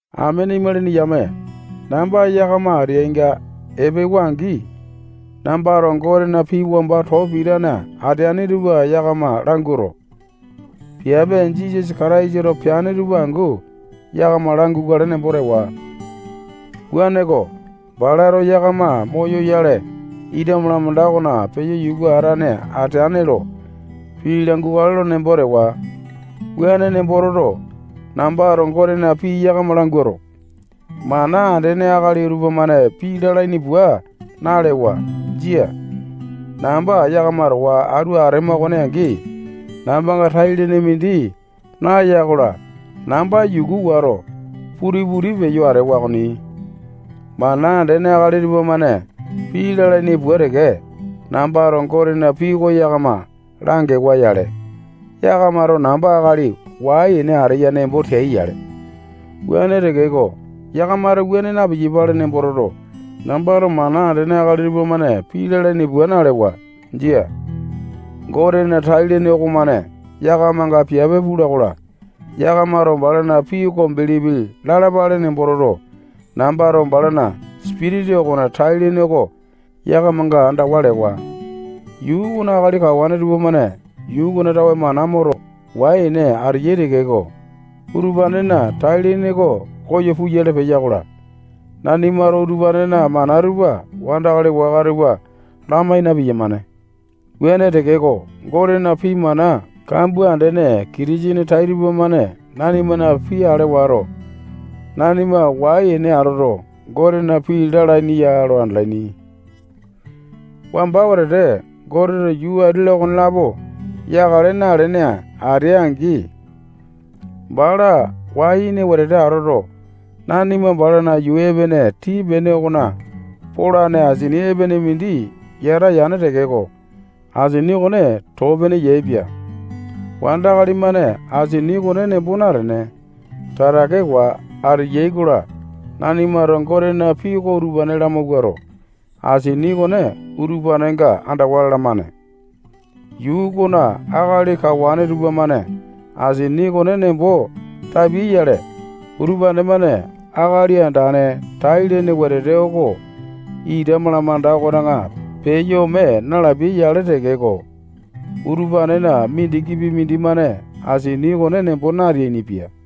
Amene imalini yame, namba yakama ateainga epewa-angi, nambato Gotena pii wamba too pitane ateane tupa yakama languato, piape Jisasa Kataisato peane tupa angu yakama langukale nembo tewa. Wuaneko, balato yakama moyoyale, ita malamanda okona peyo yuka atane ateane lo pii langukale nembo tewa. Wuane nembo toto, nambato Gotena pii yakama languato, mana andene akali tupamane pii lalaini pua nalewa. Jia. Namba yakama towa atu atema okone angi, nambanga tai-lene mindi naya-kola, namba yuku wato, puti-puti peyo atewa okoni. Mana andene akali tupamane pii lalaini pua teke, nambato Gotena pii oko yakama langewa-yale, yakamato namba akali wai-ene ateya nembo teai-yale. Wuane tekeko, yakamato wuane na-piyapale nembo toto, nambato mana andene akali tupamane pii lalaini pua nalewa. Jia. Gotena tai-lene okomane yakamanga piape pula-kola, yakamato balana pii oko bilipi lalapale nembo toto, nambato balana Sipitisa okona tai-lene oko yakamanga andawa lewa. Yuu okona akali kawane tupamane yuu okona tawe mana moto, wai-ene ateyai tekeko, utupanena tai-lene oko koyo puyale peya-kola, nanimato utupanena mana tupa wandakali waka tupa lamai na-piyamane. Wuane tekeko, Gotena pii mana kambua andene Kitisene tai tupamane nanimana pii ale wato, nanima wai-ene atoto, Gotena pii lalaini ya lo andalaini. Wamba wetete Goteto yuu ati-la, okonelapo yakale nalene atea-angi, bala wai-ene wetete atoto, nanima balana yuu epene tii-pene okona polane asini epene mindi yata yane tekeko, asini okone too-pene yaepia. Wandakali-mane asini okone nembo natene, tatakewa ateyai-kola, nanimato Gotena pii oko utupane lamawuato, asini okone utupanenga andawa lalamane. Yuu okona akali kawane tupamane asini okone nembo tapiai-yale, utupane-mane Akali Andane tai-lene wetete oko ita malamanda okona peyo ome nalapiai-yale tekeko, utupanena mindikipi mindimane asini okone nembo nateainipia.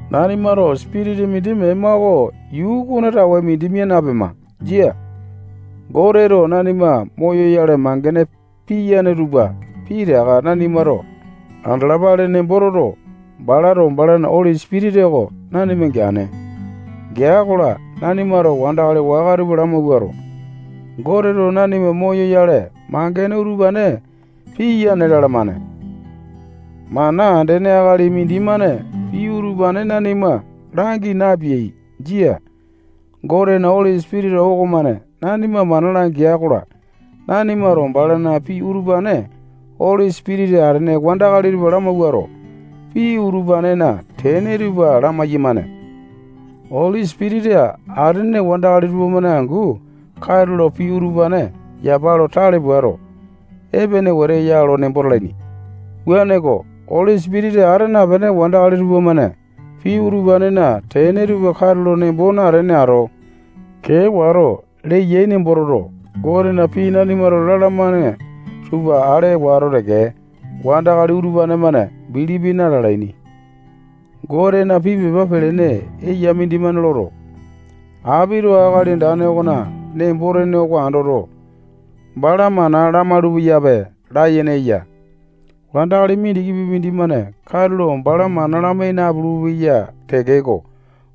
Nanimato Sipitisa mindi mema oko yuu okona tawe mindi mia napema. Jia. Goteto nanima moyoyale mangene piyane tupa pitaka nanimato andalapale nembo toto, balato balana Oli Sipitisa oko nanima geane. Gea-kola, nanimato wandakali waka tupa lamawuato, Goteto nanima moyoyale mangene utupane piyane lalamane. Mana andene akali mindimane pii utupane nanima langi napeai. Jia. Gotena Oli Sipitisa okomane nanima mana langea-kola, nanimato balana pii utupane Oli Sipitisa atene wandakali tupa lamawuato, pii utupanena tene tupa lamai-yamane. Oli Sipitisa atene wandakali tupamane angu katulo pii utupane yapa lo tale puato, epene wete ya lo nembo talaini. Wuaneko, Oli Sipitisa ata napene wandakali tupamane pii utupanena tene tupa katulo nembo natene ato, kee wato leyai nembo toto, Gotena pii nanimato lalamane tupa ale wato teke, wandakali utupane-mane bilipi na-lalaini. Gotena pii pepa pelene eya mindimane loto, apito Akali Andane okona nembo-tene oko andoto, bala mana lamalu-peyape layene eya. Wandakali mindikipi mindimane katulo bala mana lamai napulu-peya tekeko,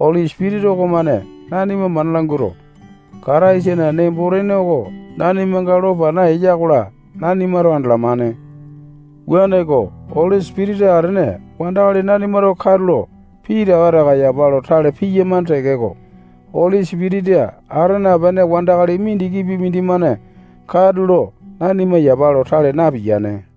Oli Sipitisa okomane nanima mana languato, Kataisana nembo-tene oko nanimanga lo pana eya-kola, nanimato andalamane. Wuaneko, Oli Sipitisa atene wandakali nanimato katulo pitaka taka yapa lo tale piyamane tekeko, Oli Sipitisa ata napene wandakali mindikipi mindimane katulo nanima yapa lo tale napiyane.